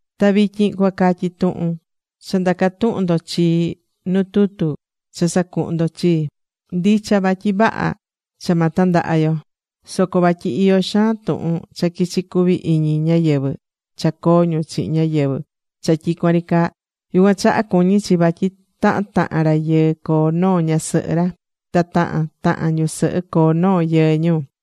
Ta vityin cuacatyi tuhun cha ndaca̱ tuhun ndo chii nu tutu cha sacuhu̱n ndo chii. Ndicha vatyi vaha cha ma tandaha yo. Soco vatyi iyó xaan tuhun cha quichí cuvi iñi ñáyɨvɨ cha coo ñu chihin ñáyɨvɨ cha tyicuan ri caa. Yucuan chaha cuñí chi vatyi tahan tahan rayɨɨ coo noo ñasɨhɨ ra, ta tahan tahan ñusɨhɨ coo noo yɨɨ ñu.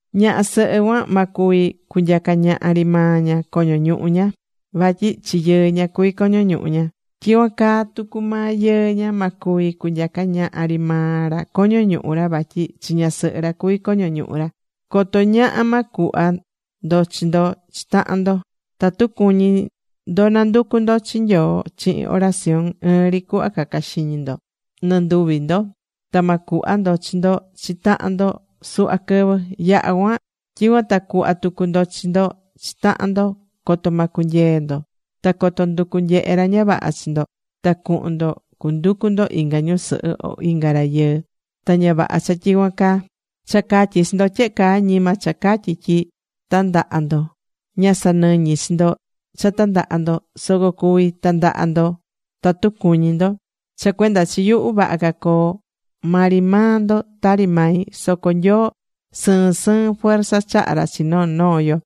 Ñaha sɨhɨ cuan ma cuvi cunyaca ñaha ri maa ña coño ñuhu ña. Vatyi chi yɨɨ ña cuví coño ñuhu ña. Tyicuan caa tucu maa yɨɨ ña, ma cuvi cunyaca ñaha ri maa ra coño ñuhu ra vatyi chi ñasɨhɨ ra cuví coño ñuhu ra. Coto ñaha ma cuhva ndo chi ndo chi tahan ndo. Tatu cuñí ndo nanducu ndo chi Nyoo chihin oración, ɨɨn ri cuhva ca̱ca xiñi nɨnduvi ndo. Ta ma cuhva ndo chi ndo chi tahan ndo suhva quɨvɨ. Yaha cuan tyicuan ta cu̱hva tucu ndo chi ndo chi tahan ndo coto ma cunyee ndo. Ta coto nducu nyehe ra ña vaha chi ndo ta cuhun ndo cunducu ndo inga ñusɨhɨ o inga rayɨɨ. Ta ña vaha cha tyicuan caa. Cha catyí chi ndo tyehe caa ñima cha catyí tyi tandaha ndo. Ña sanɨñí chi ndo cha tandaha ndo. Soco cuví tandaha ndo tatu cuñí ndo. Cha cuenda chi yuhu, vaha ca coo maa ri maa ndo tari mai. Soco Nyoo sɨɨn sɨɨn fuerza chahá ra chi noo noo yo.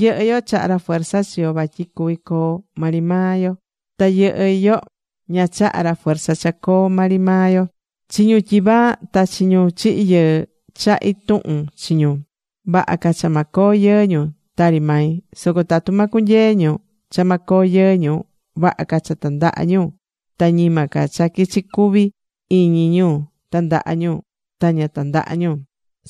Yɨhɨ́ yo chahá ra fuerza chi yo vatyi cuvi coo maa ri maa yo. Ta yɨhɨ́ yo ña chaha ra fuerza cha coo maa ri maa yo. Chi ñu tyivaa ta chi ñu chihi̱ yɨɨ, chahí tuhun chi ñu. Vaha ca cha ma coo yɨɨ ñu tari mai. Soco tatu ma cunyee ñu cha ma coo yɨɨ ñu, vaha ca cha tandaha ñu ta ñima ca cha quichi ri cuvi iñi ñu tandaha ñu, ta ña tandaha ñu.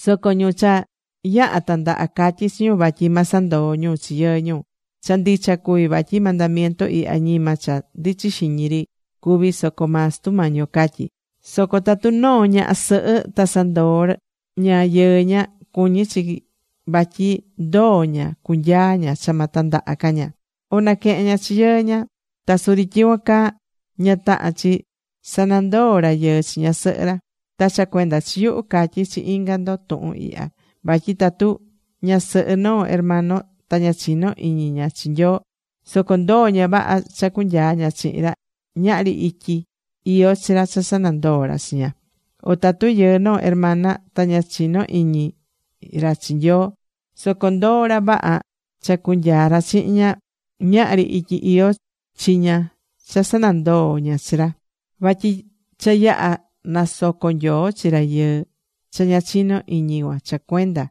Soco ñu cha yaha tandaha̱, catyí chi ñu vatyi ma sanandoo ñu chi yɨɨ ñu. Cha ndicha cuví vatyi mandamiento ihya ñima cha ndichí xiñi ri cuví soco maa Sutu Mañi yo catyí. Soco tatu noo ñaha sɨhɨ ta sanandoo̱ ña yɨɨ ña, cuñí chi vatyi ndoo ña cunyaa ña cha ma tandaha ca ña. O naquehen ña chi yɨɨ ña. Ta suri tyicuan caa, ña tahán chi sanandoo rayɨɨ chi ñasɨhɨ ra. Ta cha cuenda chi yuhu catyí chi inga ndo tuhun ihya. Vatyi tatu ñasɨhɨ noo hermano ta ña chinó iñi ña chi Nyoo, soco ndoó ña vaha cha cunyaa ña chihin ra, ñahri ityi iyó chi ra cha sanandoo ra chi ña. O tatu yɨɨ noo hermana, ta ña chinó iñi ra chi Nyoo, soco ndoó ra vaha cha cunyaa ra chihin ña, ñahri ityi iyó chi ña cha sanandoo ña chi ra. Vatyi cha yaha̱ nasoco̱ Nyoo chi rayɨɨ cha ña chinó iñi cuan cha cuenda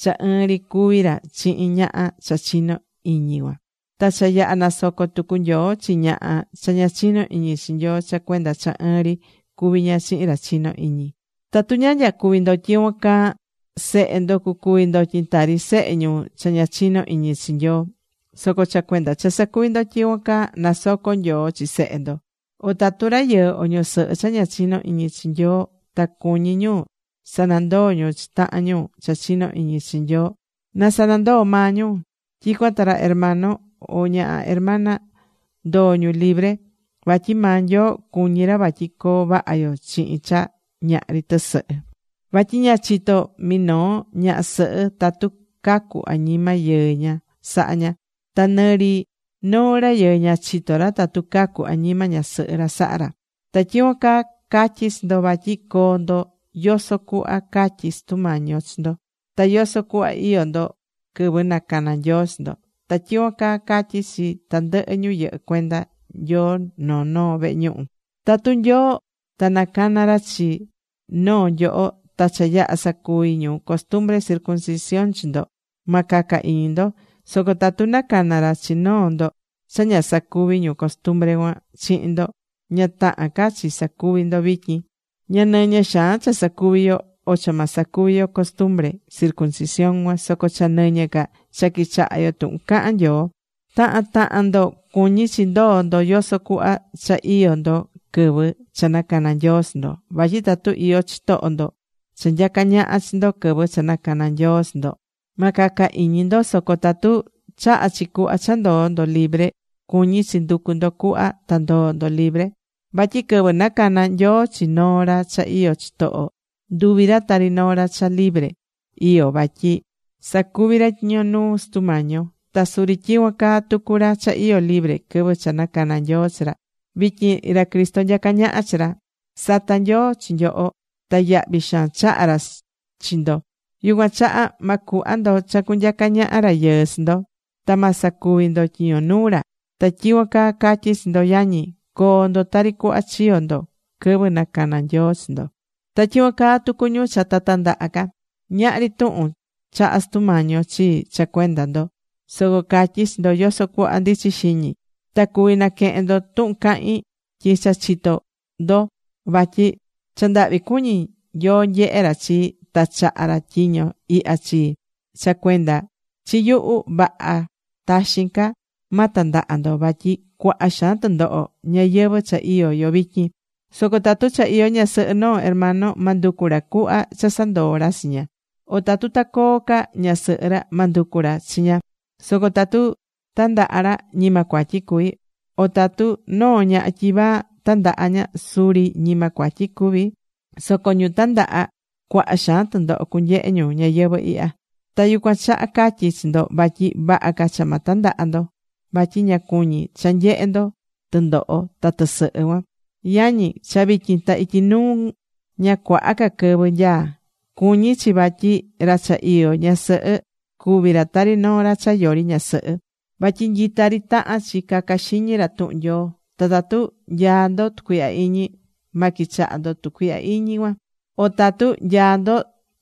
cha ɨɨn ri cuví ra chihin ñaha cha chinó iñi cuan. Ta cha yaha nasoco tucu Nyoo chi ñaha cha ña chinó iñi chi Nyoo cha cuenda cha ɨɨn ri cuví ña chihin ra chinó iñi. Tatu ña nyacuví ndo tyicuan caa, sehe ndo cucuvi ndotyin tari sehe ñu cha ña chinó iñi chi Nyoo. Soco cha cuenda cha sacuví ndo tyicuan caa, nasocó Nyoo chi sehe ndo. O tatu rayɨɨ o ñusɨhɨ cha ña chinó iñi chi Nyoo, ta cuñí ñu sanandoó ñu chi tahan ñu cha chinó iñi chi Nyoo, na sanandoo maa ñu. Tyicuan ta ra hermano o ñaha hermana ndoó ñu libre. Vatyi maa Nyoo cuñí ra vatyi coo vaha yo chihin cha ñahri tɨsɨhɨ. Vatyi ña chitó minoo ñaha sɨhɨ tatu cacu añima yɨɨ ña saha ña. Ta nɨ ri noo rayɨɨ ña chitó ra tatu cacu añima ñasɨhɨ ra saha ra. Ta tyicuan caa catyí chi ndo vatyi coo ndo yoso cuhva catyí Sutu Mañi yo chi ndo. Ta yoso cuhva iyó ndo quɨvɨ nacana̱ Nyoo chi ndo. Ta tyicuan caa catyí chi tandɨhɨ ñu yɨhɨ́ cuenda Nyoo noo noo vehe ñuhu. Tatu Nyoo ta nacana̱ ra chi noo nyoho ta cha yaha̱ sacuvi̱ ñu costumbre circuncisión chi ndo, ma caca iñi ndo. Soco tatu nacana̱ ra chi noo ndo cha ña sacuvi̱ ñu costumbre cuan chihin ndo, ña tahán ca chi sacuvi ndo vityin. Ña nɨñɨ xaan cha sacuví yo, o cha ma sacuvi yo costumbre circuncisión cuan. Soco cha nɨñɨ́ ca cha quichahá yo tuhun cahán Nyoo. Tahan tahan ndo cuñí chi ndoó ndo yoso cuhva cha iyó ndo quɨvɨ cha nacana̱ Nyoo chi ndo. Vatyi tatu iyó chitoho ndo cha nyacá ñaha chi ndo quɨvɨ cha nacana̱ Nyoo chi ndo, ma caca iñi ndo, soco tatu chahá chi cuhva cha ndoó ndo libre, cuñí chi nducu ndo cuhva ta ndoó ndo libre. Vatyi quɨvɨ nacana̱ Nyoo chi noo ra cha iyó chitoho, nduvi̱ ra tari noo ra cha libre iyó, vatyi sacuví ra tyiño nuu Sutu Mañi yo. Ta suri tyicuan caa tucu ra cha iyó libre quɨvɨ cha nacana̱ Nyoo chi ra. Vityin ra Cristo nyacá ñaha chi ra. Sata̱ Nyoo chi nyoho. Ta yahvi xaan chaha̱ ra chi ndo. Yucuan chaha ma cuhva ndo cha cunyaca ñaha rayɨɨ chi ndo. Ta ma sacuvi ndo tyiño nuu ra. Ta tyicuan caa catyí chi ndo yañi, co̱o ndo tari cuhva chiyo̱ ndo quɨvɨ nacana̱ Nyoo chi ndo. Ta tyicuan tucu ñu cha ta tandaha ca. Ñahri tuhun chaha̱ Sutu Mañi yo chii cha cuenda ndo. Soco catyí chi ndo yoso cuhva ndichí xiñi. Ta cuví naquehen ndo tuhun cahín tyi cha chitó ndo vatyi cha ndahvi cuñí Nyoo nyehe ra chii ta chaha̱ ra tyiño ihya chii. Cha cuenda chi yuhu, vaha taxin ca ma tandaha ndo. Vatyi cuaha xaan tɨndoho ñayɨvɨ̱ cha iyó yo vityin. Soco tatu cha iyó ñasɨhɨ noo hermano, ma nducu ra cuhva cha sanandoo ra chi ña. O tatu ta coo ca ñasɨhɨ ra, ma nducu ra chi ña. Soco tatu tandaha ra, ñima cuatyi cuví. O tatu noo ñaha tyivaa tandaha ña, suri ñima cuatyi cuví. Soco ñu tandaha cuaha xaan tɨndoho cunyehe ñu ñayɨvɨ̱ ihya. Ta yucuan chaha catyí chi ndo vatyi vaha ca cha ma tandaha ndo. Vatyi ña cuñí cha nyehé ndo tɨndoho ta tɨsɨhɨ cuan. Yañi, cha vityin ta ityi nuu ña cuaha ca quɨvɨ nyaá. Cuñí chi vatyi ra cha iyó ñasɨhɨ cuví ra tari noo ra cha yori ñasɨhɨ. Vatyi nyita ri tahán chi caca xiñi ra tuhun Nyoo. Ta tatu nyaá ndo tucuihya iñi, ma quichaha ndo tucuihya iñi cuan, o tatu nyaá ndo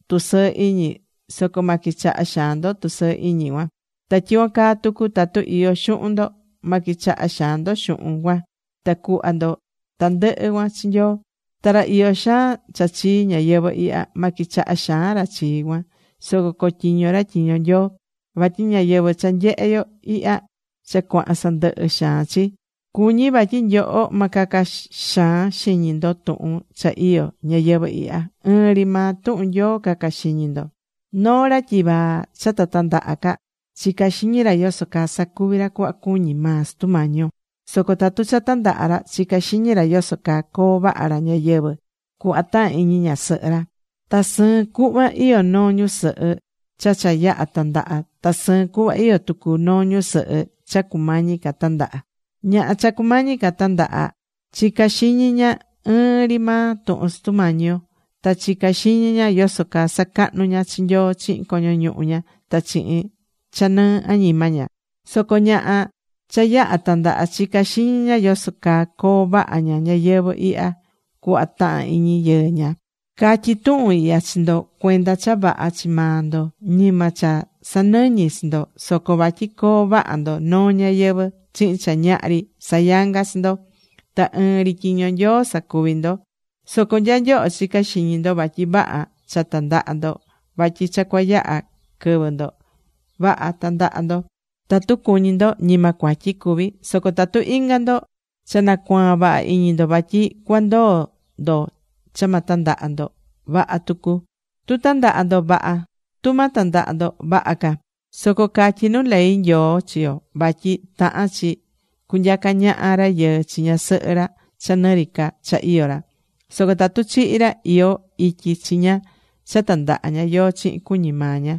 tusɨɨ iñi, soco ma quichaha xaan ndo tusɨɨ iñi cuan. Ta tyicuan caa tucu tatu iyó xuhun ndo, ma quichaha xaan ndo xuhun cuan. Na̱cuhva ndo tandɨhɨ cuan chi Nyoo. Ta ra iyó xaan cha chii ñayɨvɨ̱ ihya, ma quichaha xaan ra chi cuan, soco cotyiño ra tyiño Nyoo. Vatyi ñayɨvɨ̱ cha nyehé yo ihya cha cuahán sandɨhɨ xaan chi. Cuñí vatyi nyoho ma caca xaan xiñi ndo tuhun cha iyó ñayɨvɨ̱ ihya. Ɨɨn ri maa tuhun Nyoo caca xiñi ndo. Noo ra tyivaa cha ta tandaha ca chicá xiñi ra yoso caa sacuví ra cuhva cuñí maa Sutu Mañi yo. Soco tatu cha tandaha̱ ra, chicá xiñi ra yoso caa coo vaha ra ñayɨvɨ̱ cuhva tahan iñi ñasɨhɨ ra. Ta sɨɨn cuhva iyó noo ñusɨhɨ cha cha yaha tandaha, ta sɨɨn cuhva iyó tucu noo ñusɨhɨ cha cumañi ca tandaha. Ñaha cha cumañi ca tandaha chicá xiñi ña ɨɨn ri maa tuhun Sutu Mañi yo. Ta chicá xiñi ña yoso caa sacahnú ña chi Nyoo chihin coño ñuhu ña ta chihin cha nɨɨ añima ña. Soco ñaha cha cha yaha̱ tandaha chicá xiñi ña yoso caa coo vaha ña ñayɨvɨ̱ ihya cuhva tahán iñi yɨɨ ña. Catyí tuhun ihya chi ndo cuenda cha vaha chi maa ndo. Ñima cha sanɨñí chi ndo. Soco vatyi coo vaha ndo noo ñayɨvɨ̱ chihin cha ñahri sayangá chi ndo. Ta ɨɨn ri tyiño Nyoo sacuvi ndo. Soco nya nyoho chicá xiñi ndo vatyi vaha cha tandaha ndo vatyi cha cuayaha quɨvɨ ndo; vaha, ta̱ndaha ndo tatu cuñí ndo. Ñima cuatyi cuví cuan. Soco tatu inga ndo cha nacuaa̱n vaha iñi ndo vatyi cuandoo ndo cha ma tandaha ndo, vaha tucu. Tu tandaha ndo, vaha. Tu ma tandaha ndo, vaha ca. Soco catyí nu ley Nyoo chi yo vatyi tahán chi cunyacá ñaha rayɨɨ chi ñasɨhɨ ra cha nɨ ri ca cha iyó ra. Soco tatu chihi̱ ra, iyó ityi chi ña cha tandaha ña yóó chihin cuñí maa ña.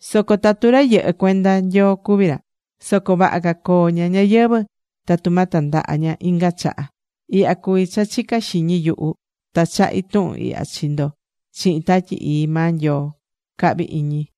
Soco tatu ra yɨhɨ́ cuenda Nyoo cuví ra. Soco vaha ca coo ña ñayɨvɨ̱ tatu ma tandaha ña inga chaha. Ihya cuví cha chicá xiñi yuhu. Ta chahí tuhun ihya chi ndo chihin Tatyi Ii maa Nyoo, cahvi iñi.